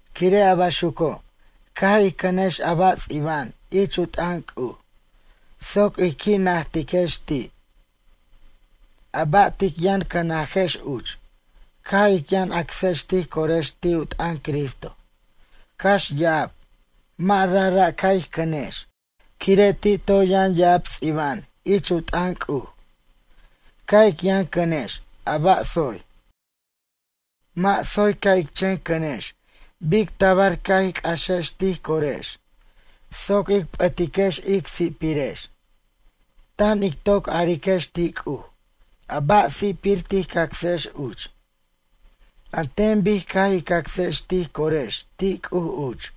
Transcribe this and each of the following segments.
Quire' a baxuco', ca' ij cʌnex a ba' ts'iba'an ich u t'ʌn C'uj soc ij qui' najtiquex ti'. A ba' tic yʌn cʌnajex uch caj ic yʌn acsex tij corex ti' u t'ʌn Cristo, cax ya'ab, mʌ' rajra' ca' ij cʌnex quire' ti' toy yʌn ya'ab ts'iba'an ich u t'ʌn C'uj. Ca' ic yʌn cʌnex a ba' tsoy. Mʌ' tsoy ca' ic chen cʌnex bic tabar ca' ij c'axex tij corex soc ic p'ʌtiquex ic si'pirex, tan ic toc ariquex ti' C'uj a ba' si'pir tij cacsex uch. An ten bic caj ij cacsex tij corex ti' C'uj uch.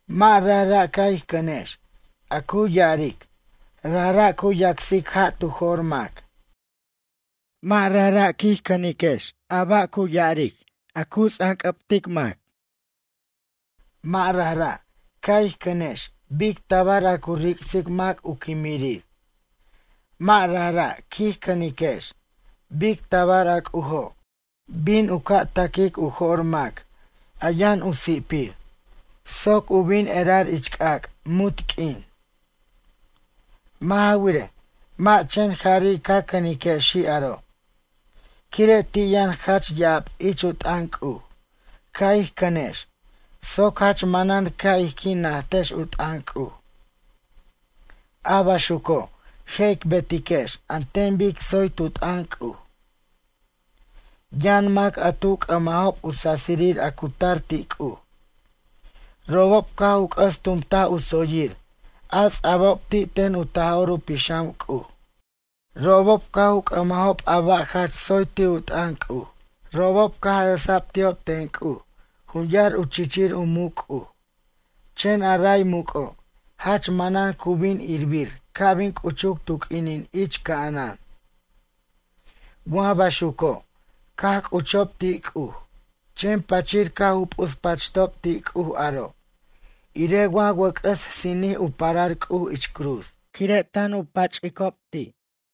Mʌ' rajra' ca' ij cʌnex a cu ya'aric, rajra' cu yacsic ja' tu jor mac, mʌ' rajra' quij cʌnex a ba' a cu ya'aric, cu ts'anc'ʌbtej mac. Mʌ' rajra' ca' ij cʌnex bic tabar a cu ric'sic mac u quimirir, mʌ' rajra' quij cʌniquex bic tabar a C'ujo' bin u ca' ta'quic u jo'r mac a yʌn u si'pir soc u bin erar ich c'ac' munt q'uin. Mʌ' ja wirej, mʌ' chen jari' caj cʌnexi' aro'. Quire' ti' yʌn jach ya'ab ich u t'ʌn C'uj ca' ij cʌnex soc jach manan ca' ij qui' najtex u t'ʌn C'uj. A baxuco' je' ic betiquex an ten bic tsoy tu t'ʌn C'uj. Yʌn mac a tu c'ʌmajob u sasirir a cu tar ti' C'uj. Robob caj u c'ʌs tumtaj u tsoyir a ts'a'bob ti' ten u Taj'or u Pixam C'uj. Robob caj u c'ʌmajob a ba' jach tsoy ti' u t'ʌn C'uj. Robob caj esa'b ti'ob ten C'uj jun yar u chichir u muc' C'uj, chen a ray muc'o' jach manan cu bin irbir ca' bin c'uchuc tu q'uinin ich ca'anan. Wa baxuco' caj c'uchob ti' C'uj chen pachir caj u p'uspachtob ti' C'uj aro' irej wa wʌc'ʌs sinij u parar C'uj ich cruz quire' tan u pach'icob ti'.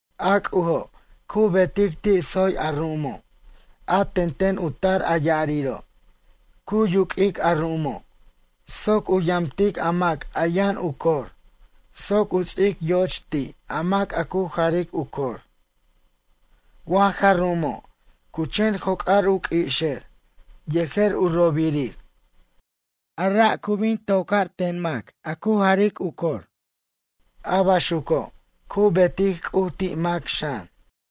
A C'ujo' cu betic ti' tsoy a ru'umo', a tenten u tar a ya'ariro' cu yuq'uic a ru'umo' soc u yamtic a mac a yʌn u cor soc u ts'ic yo'och ti' a mac a cu jaric u cor. Wa ja ru'umo' cu chen joc'ar u q'ui'ixer yejer u ro'obir, a ra' cu bin tocar ten a mac a cu jaric u cor. A baxuco' cu betic C'uj ti' mac xan.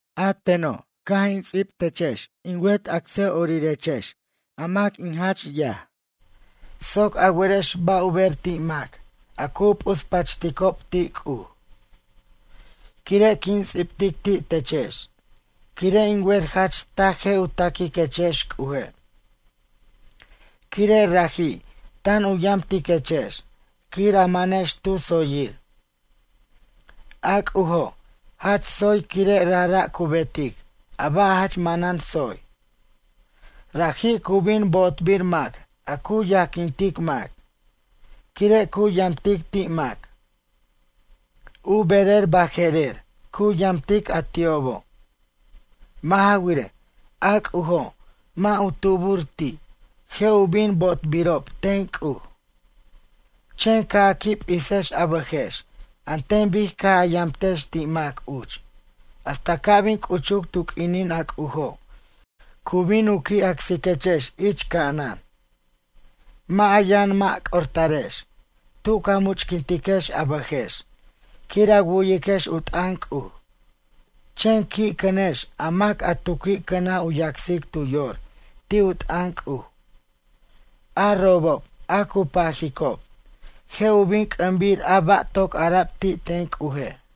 A teno' caj in ts'ib techex in wet acsʌ'orirex a mac in jach yaj soc a werex ba' u ber ti' mac a cu p'uspachticob ti' C'uj. Quire' quin ts'ibtic ti' techex quire' in wer jach taj je' u taquiquechex C'uje'. Quire' raji' tan u yamtiquechex quir a manex tu tsoyir. A C'ujo', jach tsoy quire' rajra' cu betic a ba' jach manan tsoy. Raji' cu bin bo'otbir mac a cu yajquintic mac, quire' cu yamtic ti' mac. U berer baje'rer cu yamtic a ti'obo'. Mʌ' ja wirej, a C'ujo' mʌ' u tubur ti', je' u bin bo'otbirob ten C'uj. Chen ca' a qui' p'isex a bʌjex an ten bic caj a yamtex ti' mac uch hasta ca' bin c'uchuc tu q'uinin a C'ujo' cu bin u qui' acsiquechex ich ca'anan. Mʌ' a yʌn mʌ' c'ortarex tu ca much'quintiquex a bʌjex quir a wu'yiquex u t'ʌn C'uj, chen qui' cʌnex a mac a tu qui' cʌnaj u yacsic tu yor ti' u t'ʌn C'uj, a robob a cu pajicob, je' u bin c'ʌmbir a ba' toc ara'b ti' ten C'uje'.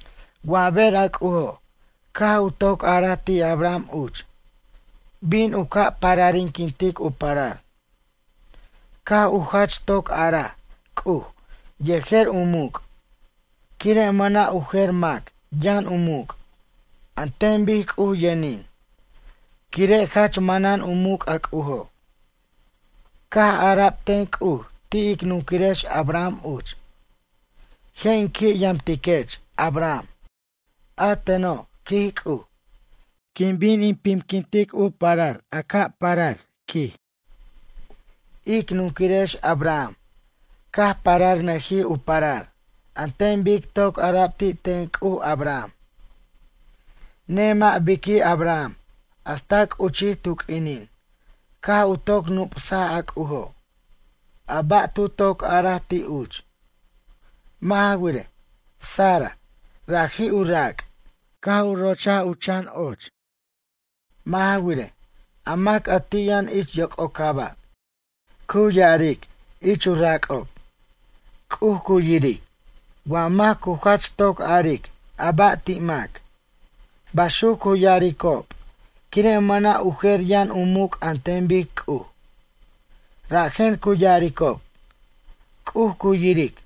Wa ber a C'ujo' caj u toc araj ti' Abraham uch, bin u ca' pararinquintic u parar, caj u jach toc araj C'uj yejer u muc', quire' mʌna' u jer mac yʌn u muc' an ten bic C'uj yʌnin, quire' jach manan u muc' a C'ujo'. Caj ara'b ten C'uj ti' ic nunquirex Abraham uch: “Je' in qui' yamtiquech Abraham. A teno', quij C'uj, quin bin in pimquintic u parar a ca' parar”, quij. Ic nunquirex Abraham caj pararnʌjij u parar an ten bic toc ara'b ti' ten C'uj Abraham. Nemʌ' biqui' Abraham hasta c'uchij tu q'uinin caj u toc nup'saj a C'ujo', a ba' tu toc araj ti' uch. Mʌ' ja wirej, Sara, raji' u rac', caj u rochaj u chan ochir. Mʌ' ja wirej, a mac a ti' yʌn ich yoc'ocaba' cu ya'aric ich u rac'ob: “C'uj cu yiric”, wa mac cu jach toc aric a ba' ti' mac. Baxuc cu ya'aricob, quire' mʌna' u jer yʌn u muc' an ten bic C'uj. Rajen cu ya'aricob: “C'uj cu yiric”,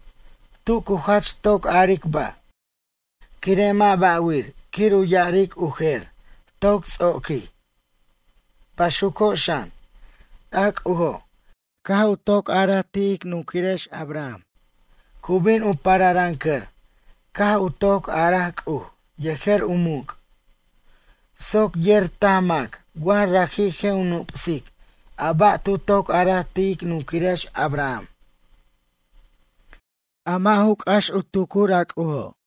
tu cu jach toc aric ba', quire' mʌ' ba'wir quir u ya'aric u jer, toc ts'oquij. Baxuco' xan, a C'ujo' caj u toc araj ti' ic nunquirex Abraham, cu bin u pararʌncʌr caj u toc a'araj C'uj yejer u muc', soc yer taj mac wa raji' je' u nup'sic a ba' tu toc araj ti' ic nunquirex Abraham. A mʌ' ju c'ax u tucur a C'ujo'.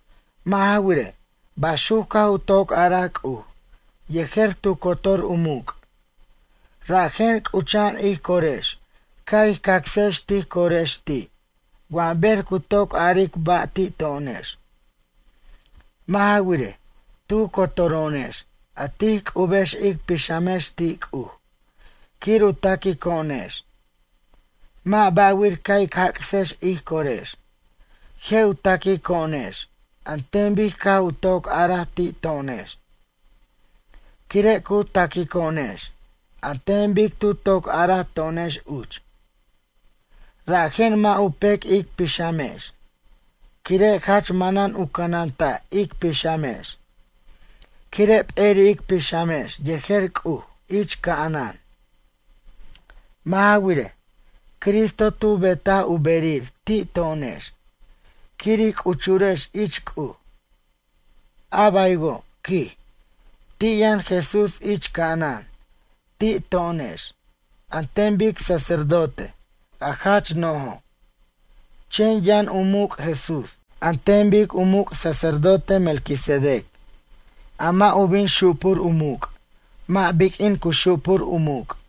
Mʌ' ja wirej, baxuc caj u toc araj C'uj yejer tu cotor u muc', rajen c'ucha'an ij corex ca' ij cacsex tij corex ti' wa ber cu toc aric ba' ti' to'onex. Mʌ' ja wirej, tu cotoro'onex a tij c'ubex ic pixamex ti' C'uj quir u taquico'onex, mʌ' ba'wir ca' ic jac'sex ij corex. Je' u taquico'onex an ten bic caj u toc araj ti' to'onex. Quire' cu taquico'onex an ten bic tu toc araj to'onex uch. Rajen mʌ' u pec ic pixamex, quire' jach manan u cʌnanta' ic pixamex quire' p'eri' ic pixamex yejer C'uj ich ca'anan. Mʌ' ja wirej, Cristo tu betaj u berir ti' to'onex quir ij c'uchurex ich C'uj. A baywo', quij, ti' yʌn Jesús ich ca'anan ti' to'onex an ten bic sacerdote a jach no'jo', chen yʌn u muc' Jesús an ten bic u muc' sacerdote Melquisedec, a mʌ' u bin xupur u muc' mʌ' biq'uin cu xupur u muc'.